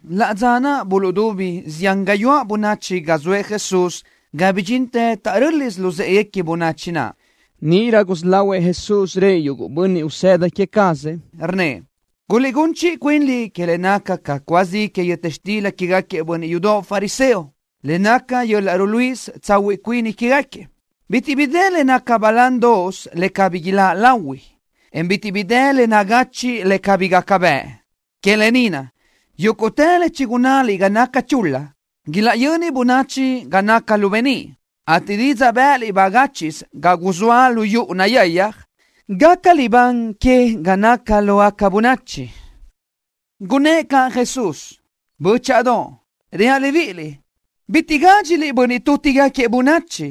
Laʼ dza naʼ buluʼdubi zián gayuáʼ bönachi ga zoëʼ Jesús ga bidxintë taʼrö́lisö luzë́ʼeguequi bönachi naʼ. Níʼirö gusí lahuëʼ Jesús rëʼ yuguʼ bönniʼ usëda queë cazëʼ, rnnëʼ: —Guliʼgún chiʼi cuinliʼ que le naca ca cúa zi que yöta xtila quégaquiëʼ bönniʼ yudoʼ fariseo, le naca yöl-laʼ ruluíʼisö tsahuiʼ cuini quégaquiëʼ. Bitiʼ bi dë le naca balándoʼos le cabí iláʼ lahui, en bitiʼ bi dë le nagachiʼ le cabí gaca bëʼ. Que lë ni naʼ, yúguʼtë le chigunnáliʼ ga naca chul-la, ilaʼyöni bönachi ga naca lu beníʼ, ateʼ didzaʼ bë́ʼëliʼ bagáchiʼsö ga guzóa lu yuʼu nayayaj, gaca libán que ga naca lógaca bönachi. Gunnë́ʼ caʼ Jesús: —Bö́chaʼadoʼ, reaʼ libíʼiliʼ: Bitiʼ gádxiliʼ bönniʼ tútigaquiëʼ bönachi,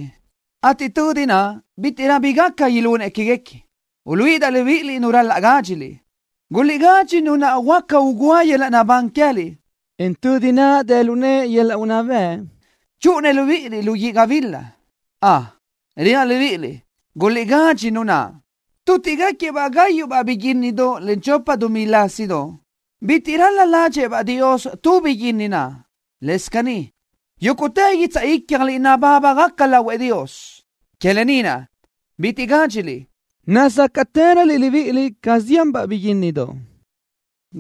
ateʼ tödi naʼ bítiʼrö bi gaca ilunëʼ quéguequi. Uluíʼidaʼ libíʼiliʼ nu ral-laʼ gádxiliʼ. Guliʼgadxi Nu naʼ gaca ugúa yöl-laʼ naʼbán queë́liʼ, en tödi naʼ dë lu nëʼë yöl-laʼ unná bëʼ chúʼunëʼ libíʼiliʼ lu guíʼ gabila. Ön, reaʼ libíʼiliʼ, guliʼgadxi Nu naʼ. ’Tútiʼgaquiëʼ-baʼ gáyuʼbaʼ biguínnidoʼ len chopa dumí lásidoʼ. Bitiʼ ral-la ládxëʼë-baʼ Dios tu biguínnidoʼ naʼ. Lëscaʼ caní, yúguʼtë guitsaʼ ícjaliʼ nabábagaca lahuëʼ Dios. Que lë ni naʼ, bitiʼ gádxiliʼ. Nazácaʼtëröliʼ libíʼiliʼ ca zianbaʼ biguínnidoʼ.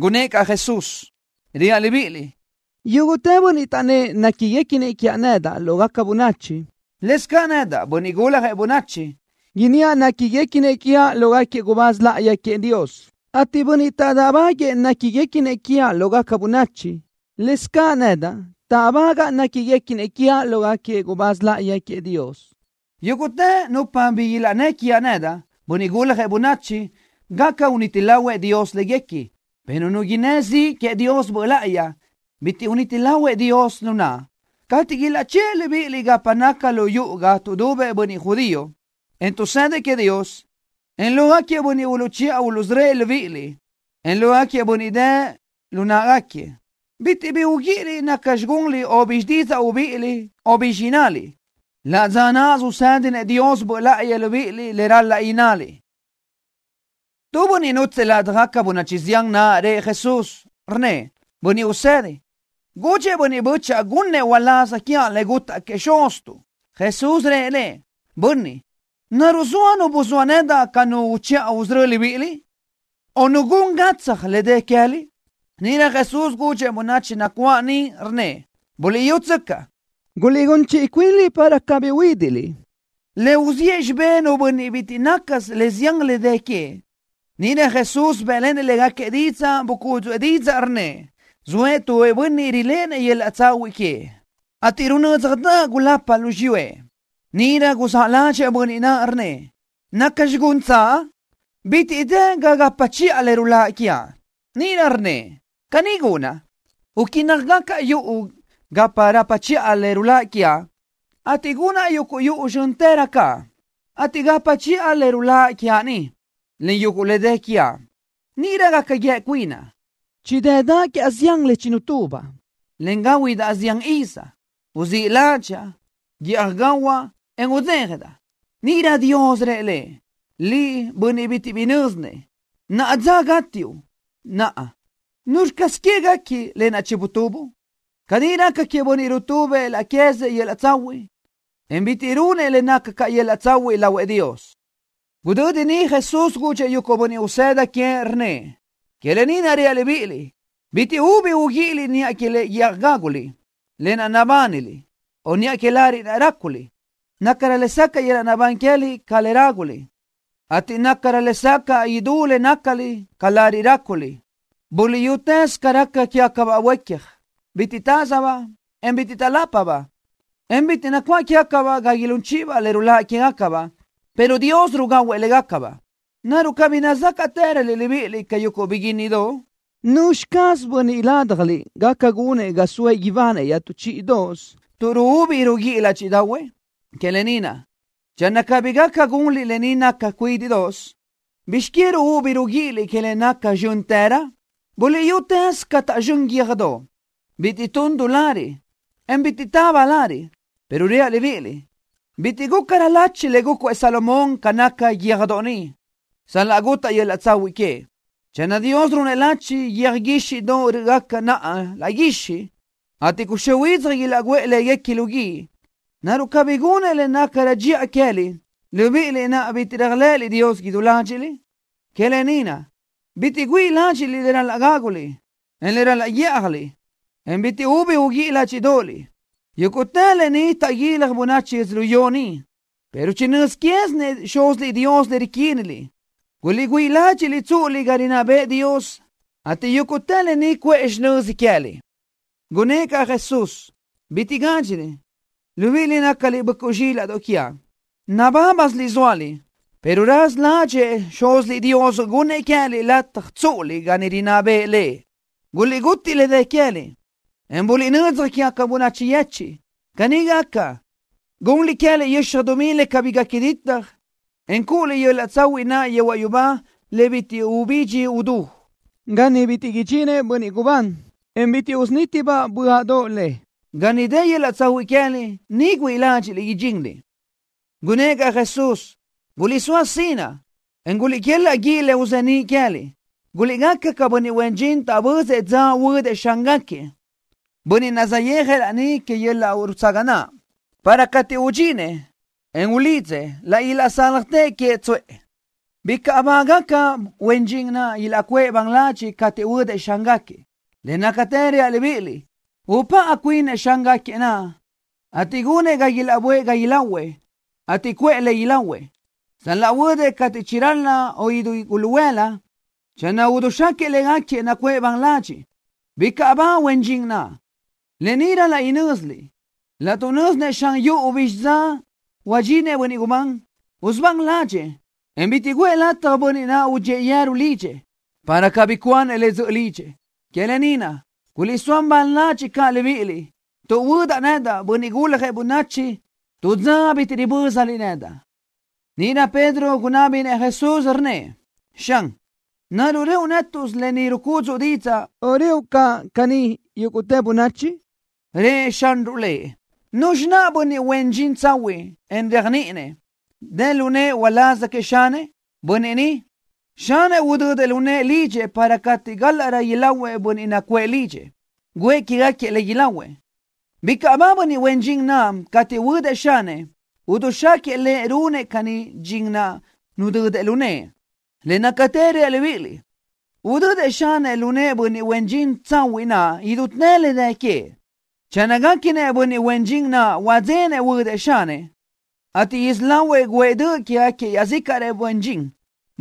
Gunnë́ʼ caʼ Jesús: —Reaʼ libíʼiliʼ: Yúguʼtë bönniʼ taʼnnë́ʼ néquiguequinëʼ quiaʼ nedaʼ lógaca bönachi, lëscaʼ nedaʼ, Bönniʼ Guljëʼ Bönachi, inníaʼ néquiguequinëʼ quiaʼ lógaquiëʼ gubáz láʼayi queëʼ Dios, ateʼ bönniʼ taʼdáʼbaguëʼë néquiguequinëʼ quiaʼ lógaca bönachi, lëscaʼ nedaʼ táʼbagaʼa néquiguequinëʼ quiaʼ lógaquiëʼ gubáz láʼayi queëʼ Dios. ’Yúguʼtë nupa bi ilaʼnnë́ quiaʼ nedaʼ, Bönniʼ Guljëʼ Bönachi, gaca uniti lahuëʼ Dios léguequi, pero nu innë́ ziʼ queëʼ Dios Böʼ Láʼayi, bitiʼ uniti lahuëʼ Dios nu naʼ. ’Cateʼ ilaʼchë́ʼë libíʼiliʼ gapa naca lu yuʼu ga tuʼdubëʼ bönniʼ judío, en tuʼsëdëʼ queëʼ Dios, en lógaquiëʼ bönniʼ uluʼchiʼa uluʼsörö́ëʼ libíʼiliʼ, en lógaquiëʼ bönniʼ dë lu náʼagaquiëʼ, bitiʼ ubi uguíʼiliʼ nacxi gunliʼ o bizxi didzaʼ ubíʼiliʼ, o bizxi innaliʼ. Laʼ dza náʼasö usédinëʼ Dios Böʼ Láʼayi libíʼiliʼ le ral-laʼ innaliʼ. Tu bönniʼ nútsëʼë ladaj bönachi zián naʼ rëʼ Jesús, rnnëʼ: —Bönniʼ Usedi, gudxëʼ bö́chaʼa gunnëʼ uláz quiaʼ le gutaʼ queëʼ xuztuʼ. Jesús rëʼ lëʼ: —Bönniʼ. ¿Naruʼ zoa nu buzóa nedaʼ ca nu uchiʼa usörö́ libíʼiliʼ, o nu gun gatsaj le dë queë́liʼ? Níʼirö Jesús gudxëʼ bönachi nacuáʼ niʼ, rnnëʼ: —Buliʼyútsöcaʼ. Guliʼgún chiʼi cuinliʼ para cabí uhuídiʼliʼ. Le uziʼë xibé nu bönniʼ bitiʼ nácasö le zián le dë queëʼ. Níʼirö Jesús bë́ʼlenëʼ légaquiëʼ didzaʼ, bucúdzuʼë didzaʼ, rnnëʼ: —Zoëʼ tu bönniʼ riléʼenëʼ yöl-laʼ tsahuiʼ queëʼ, ateʼ runö́dzjadaʼ gulapa lu xiyúëʼ. Níʼirö guzáʼ ládxëʼë bönniʼ naʼ, rnnëʼ: “¿Nacxi guntsaʼ? Bitiʼ dë ga gapa chiʼa le ruláʼ quiaʼ.” Níʼirö rnnëʼ: “Caní gunaʼ. Uquínnajgacaʼ yuʼu ga rapa chiʼa le ruláʼ quiaʼ, ateʼ gunaʼ yuguʼ yuʼu zxö́ntërö caʼ, ateʼ gapa chiʼa le ruláʼ quiaʼ niʼ, len yuguʼ le dë quiaʼ. Níʼirö gaca guíë cuinaʼ: Chidë́daʼ quiaʼ zián le chinutubaʼ, le gáhuidaʼ zián iz. Uzíʼ ládxaʼa. Guíʼaj gahuaʼ, en udzéjadaʼ.” Níʼirö Dios rëʼ lëʼ: “Liʼ, bönniʼ bitiʼ bi nö́zinëʼ. Naʼa dzöʼ gátiuʼ. Naʼa, ¿nuzxi caz guequi que, lë naʼ chinutubuʼ?” Caní raca queëʼ bönniʼ rutubëʼ laʼ queë́zëʼ yöl-laʼ tsahuiʼ, en bitiʼ runëʼ le naca ca yöl-laʼ tsahuiʼ lahuëʼ Dios. Gudödi niʼ Jesús gudxëʼ yuguʼ bönniʼ usëda queëʼ, rnnëʼ: —Que lë ni naʼ reaʼ libíʼiliʼ: Bitiʼ ubi uguíʼiliʼ niʼa que le guíʼaj gáguliʼ, lë naʼ nabániliʼ, o niʼa que lariʼ gáculiʼ. Nácarö lesacaʼ yöl-laʼ naʼbán queë́liʼ ca le ráguliʼ, ateʼ nácarö lesacaʼ idú le nácaliʼ ca lariʼ ráculiʼ. Buliʼyutëz ca raca quégacabaʼ boíquiaj. Bitiʼ tázabaʼ, en bitiʼ taʼlápabaʼ, en bitiʼ nacuáʼ quégacabaʼ ga ilún chíʼibaʼ le ruláʼ quégacabaʼ, pero Dios rugahuëʼ légacabaʼ. ¿Naruʼ cabí nazácaʼtëröliʼ libíʼiliʼ ca yuguʼ biguínnidoʼ? ¿Nuzxi caz bönniʼ ládjaliʼ gaca gunëʼ ga soëʼ ibanëʼ iaʼtú chíʼidoʼos tuʼ ruúbi ruguíʼi ládxiʼdaʼahuëʼ? Que lë ni naʼ, channö cabí gaca gunliʼ lë ni naca cuídiʼsö, ¿bizx que ruúbi ruguíʼiliʼ niʼa que le naca zxö́ntërö? ’Buliʼyutëz ca taʼzxö́n yöjdoʼ. Bitiʼ tun du lariʼ, en bitiʼ taba lariʼ, pero reaʼ libíʼiliʼ, bitiʼ gúcarö lachi le gúcuëʼ Salomón ca nácagaca yöjdoʼ ni, sal-laʼ gútaʼdaʼ yöl-laʼ tsahuiʼ queëʼ. Channö Dios runëʼ lachi yöj guíxiʼdoʼ rö́ʼgaca naʼa laʼ guixiʼ, ateʼ cuxö́ huidzaj ilaʼguʼë léguequi lu guíʼ, ¿naruʼ cabí gunëʼ le nácarö dxiʼa queë́liʼ, libíʼiliʼ naʼ bitiʼ réajlëʼëliʼ Dios idú ládxiʼliʼ? Que lë ni naʼ, bitiʼ güíʼi ládxiʼliʼ le ral-laʼ gáguliʼ, en le ral-laʼ guíʼjaliʼ, en bitiʼ ubi uguíʼi ládxiʼdoʼoliʼ. Yúguʼtë lë ni taʼguilaj bönachi yödzölió ni, pero chinö́z quézinëʼ Xúziliʼ Dios le riquíniliʼ. Guliʼgüíʼ ládxiʼliʼ tsúʼuliʼ ga rinná bëʼë Dios, ateʼ yúguʼtë lë ni cuʼë xinöza queë́liʼ. Gunnë́ʼ caʼ Jesús: —Bitiʼ gádxiliʼ, libíʼiliʼ naʼ nácaliʼ böʼcuʼ zxílaʼdoʼ quiaʼ. Nabábasiliʼ zóaliʼ, pero raza ládxëʼë Xúziliʼ Dios gunnëʼ queë́liʼ lataj tsúʼuliʼ ga niʼ rinná bëʼë Lëʼ. Guliʼgutiʼ le dë queë́liʼ, en buliʼnödzaj quégaca bönachi yechiʼ. Caní gaca, gunliʼ queë́liʼ yöxaj dumí le cabí gaca ditaj, en cúʼuliʼ yöl-laʼ tsahuiʼ naʼ yehuaʼ yubá le bitiʼ ubidxi udú, ga niʼ bitiʼ idxinëʼ bönniʼ gubán, en bitiʼ usunítibaʼ böaʼdoʼ le. Ga niʼ dë yöl-laʼ tsahuiʼ queë́liʼ, niʼ güíʼi ládxiʼliʼ idxinliʼ. Gunnë́ʼ caʼ Jesús: —Guliʼsóa sinaʼ, en guliʼquelaʼ guíʼ le uzeníʼ queë́liʼ. Guliʼgaca ca bönniʼ huen dxin taʼbözëʼ dza huödëʼ xángaquiëʼ, bönniʼ saʼyéajëʼ laní que yöl-laʼ rutsaga naʼ, para cateʼ udxinëʼ, en ulidzëʼ, laʼ ilaʼsáljatëʼ queëʼ tsuʼë. Bicaʼ bágaca huen dxin naʼ ilaʼcuʼë ban ladxiʼ cateʼ huödëʼ xángaquiëʼ. Le nácatë reaʼ libíʼiliʼ, upáʼa cuinëʼ xángaquiëʼ naʼ, ateʼ gunëʼ ga ilaʼböʼë ga ilahuëʼ, ateʼ cuʼë le ilahuëʼ. Sal-laʼ huödëʼ cateʼ chiral-la o idú guluhuëla, channö idixáquiëʼ légaquiëʼ nacuʼë ban ladxiʼ, bicaʼ bágaca huen dxin naʼ. Lë ni ral-laʼ inö́ziliʼ. Laʼtuʼ nö́zinëʼ xan yuʼu bizxi dza huadxinëʼ bönniʼ gubán, usubán ládxëʼë, en bitiʼ guʼë lataj bönniʼ naʼ udxíëʼ yeru lidxëʼ, para cabí cuanëʼ le dzöʼö lidxëʼ. Que lë ni naʼ, guliʼsóa ban ladxiʼ caʼ libíʼiliʼ, tuʼ huödaʼ nedaʼ, Bönniʼ Guljëʼ Bönachi, tu dza bitiʼ ribö́zaliʼ nedaʼ. Níʼirö Pedro gunábinëʼ Jesús, rnnëʼ: —Xan, ¿naruʼ reoʼ nétuʼsö lë ni rucúdzuʼu didzaʼ, o reoʼ caʼ caní yúguʼtë bönachi? Rëʼ Xanruʼ lëʼ: —¿Nuzxi naʼ bönniʼ huen dxin tsahuiʼ, en réajniʼinëʼ, dë lu nëʼë uláz queëʼ xanëʼ? Bönniʼ ni, xanëʼ udödëʼ lu nëʼë lidxëʼ para cateʼ gálaʼrö ilahuëʼ bönniʼ nacuʼë lidxëʼ, guʼë que queë́gaquiëʼ le ilahuëʼ. Bicaʼ ba bönniʼ huen dxin naʼ cateʼ huödëʼ xanëʼ, idixáquiëʼ lëʼ runëʼ caní dxin naʼ nudödëʼ lu nëʼë. Le nácatë reaʼ libíʼiliʼ, udödëʼ xanëʼ lu nëʼë bönniʼ huen dxin tsahuiʼ naʼ idutë le dë queëʼ. Channö guéquinëʼ bönniʼ huen dxin naʼ huadzenëʼ huödëʼ xanëʼ, ateʼ isí lahuëʼ guʼë döʼ quégaquiëʼ iaʼzícaʼrëʼ huen dxin,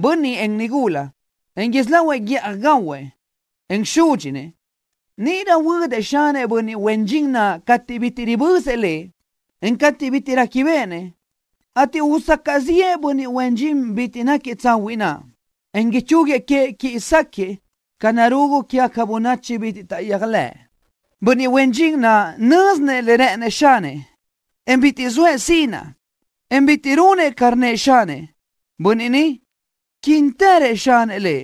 bönniʼ en nigula, en isí lahuëʼ guíʼaj gahuëʼ, en súdxinëʼ, níʼirö huödëʼ xanëʼ bönniʼ huen dxin naʼ cateʼ bitiʼ ribözëʼ lëʼ, en cateʼ bitiʼ réquibeʼenëʼ, ateʼ usacaʼ ziʼë bönniʼ huen dxin bitiʼ náquiëʼ tsahuiʼ naʼ, en ichúguiëʼ queëʼ quiʼi sáquiëʼ ca narugu quégaquiëʼ bönniʼ bitiʼ taʼyéajlëʼë. ’Bönniʼ huen dxin naʼ nö́zinëʼ le rë́ʼënëʼ xanëʼ, en bitiʼ zoëʼ sinaʼ, en bitiʼ runëʼ ca rnnëʼ xanëʼ, bönniʼ ni, quínitërëʼ xanëʼ lëʼ.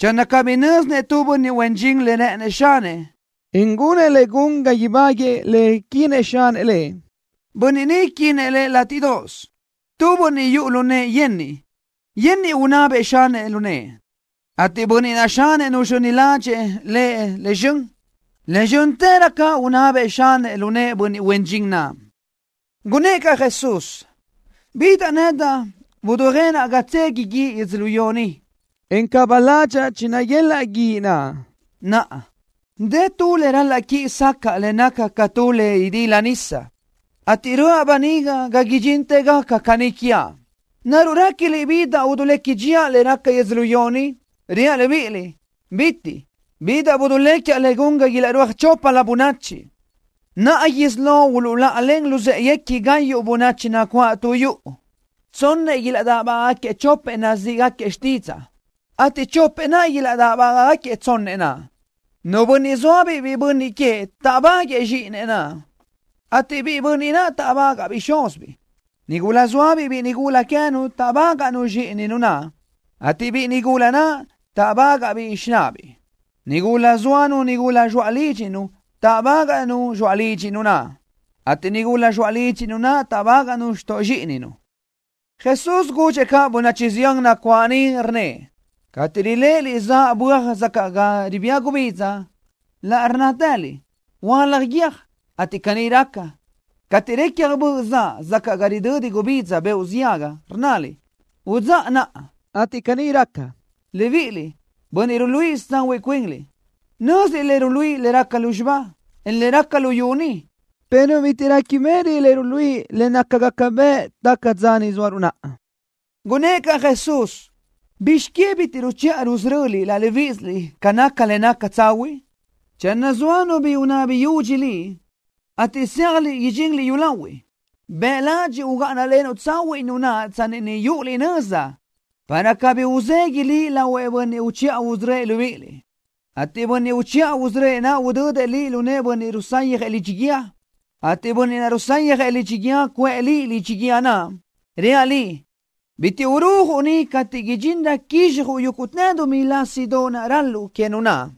Channö cabí nö́zinëʼ tu bönniʼ huen dxin le rë́ʼënëʼ xanëʼ, en gunëʼ le gun ga ibáguëʼë le quinëʼ xanëʼ lëʼ, bönniʼ ni quinëʼ lëʼ látiʼdoʼos. Tu bönniʼ yuʼu lu nëʼë yenniʼ, yenniʼ unabëʼ xanëʼ lu nëʼë, ateʼ bönniʼ naʼ xanëʼ nuzxöni ládxëʼë lëʼ le zxön, le zxö́ntërö caʼ unabëʼ xanëʼ lu nëʼë bönniʼ huen dxin naʼ. Gunnë́ʼ caʼ Jesús: —Bidaʼ nedaʼ dujénaʼ ga tsegui guíʼ yödzölió ni, en caba ládxaʼa chinaguélaʼ guíʼ naʼ. Naʼa, dë tu le ral-laʼ quiʼi sacaʼa le naca ca tu le idílidaʼ nisa, ateʼ röʼa böniga ga idxintë gaca caní quiaʼ. ¿Naruʼ réquiliʼ bidaʼ dulequi dxíaʼ le raca yödzölió ni? Reaʼ libíʼiliʼ: ¡Calëga! Bidaʼ duléquiaʼ le gun ga ilaʼrúaj choplö bönachi. Naʼa isí lo uluʼláʼalen luzë́ʼeguequi gayuʼ bönachi nacuáʼ tu yuʼu. Tsonnëʼ ilaʼdáʼbaguëʼë chopëʼ nazíʼigaquiëʼ xtídzaʼa, ateʼ chopëʼ naʼ ilaʼdáʼbaguëʼë tsonnëʼ naʼ. Nu bönniʼ zóabiʼ biʼi bönniʼ queëʼ táʼbaguëʼë zxíʼinëʼ naʼ, ateʼ biʼi bönniʼ naʼ táʼbagaʼbiʼ xúzibiʼ. Nigula zóabiʼ biʼi nigula queë́nu táʼbagaʼnu zxíʼininu naʼ, ateʼ biʼi nigula naʼ táʼbagaʼbiʼ xináʼabiʼ. Nigula zóanu nigula zxoaʼ lídxinu táʼbagaʼnu zxoaʼ lídxinu naʼ, ateʼ nigula zxoaʼ lídxinu naʼ táʼbagaʼnu xtoʼ zxíʼininu. Jesús gudxëʼ caʼ bönachi zián nacuáʼ niʼ, rnnëʼ: —Cateʼ riléʼeliʼ zaʼ böaj sacaʼ ga ribía gubidza, laʼ rnnátëliʼ: “Hualaj guiö́j”, ateʼ caní raca. Cateʼ recja böʼ zaʼ sacaʼ ga ridödi gubidza beoʼ ziaga, rnnaliʼ: “Udzáʼa naʼa”, ateʼ caní raca. Libíʼiliʼ, bönniʼ ruluíʼisö tsahuiʼ cuinliʼ. Nö́ziliʼ le ruluíʼi le raca lúzxiba, en le raca luyú ni, pero bitiʼ réquibeʼeliʼ le ruluíʼi le nácagaca bëʼ taca dza ni zóaruʼ naʼa. Gunnë́ʼ caʼ Jesús: —¿Bizx que bitiʼ ruchiʼa rusöröliʼ laʼ libíʼisiliʼ ca naca le naca tsahuiʼ? Channö zoa nu bi unabi yudxi liʼ, ateʼ zéajliʼ idxinliʼ yúlahuiʼ, bëʼ ladxiʼ ugáʼanalenuʼ tsahuiʼ nu naʼ tsanni niʼ yúʼuliʼ nöza, para cabí uzegui liʼ lahuëʼ bönniʼ uchiʼa usörö́ëʼ libíʼiliʼ, ateʼ bönniʼ uchiʼa usörö́ëʼ naʼ udödëʼ liʼ lu nëʼë bönniʼ rusayjëʼ lidxi guíë, ateʼ bönniʼ naʼ rusayjëʼ lidxi guíë cuʼë liʼ lidxi guíë naʼ. Reaʼ liʼ, bitiʼ urujuʼ niʼ cateʼ údxirö quizxjuʼ yúguʼtë dumí lásidoʼ ral-luʼu que nu naʼ.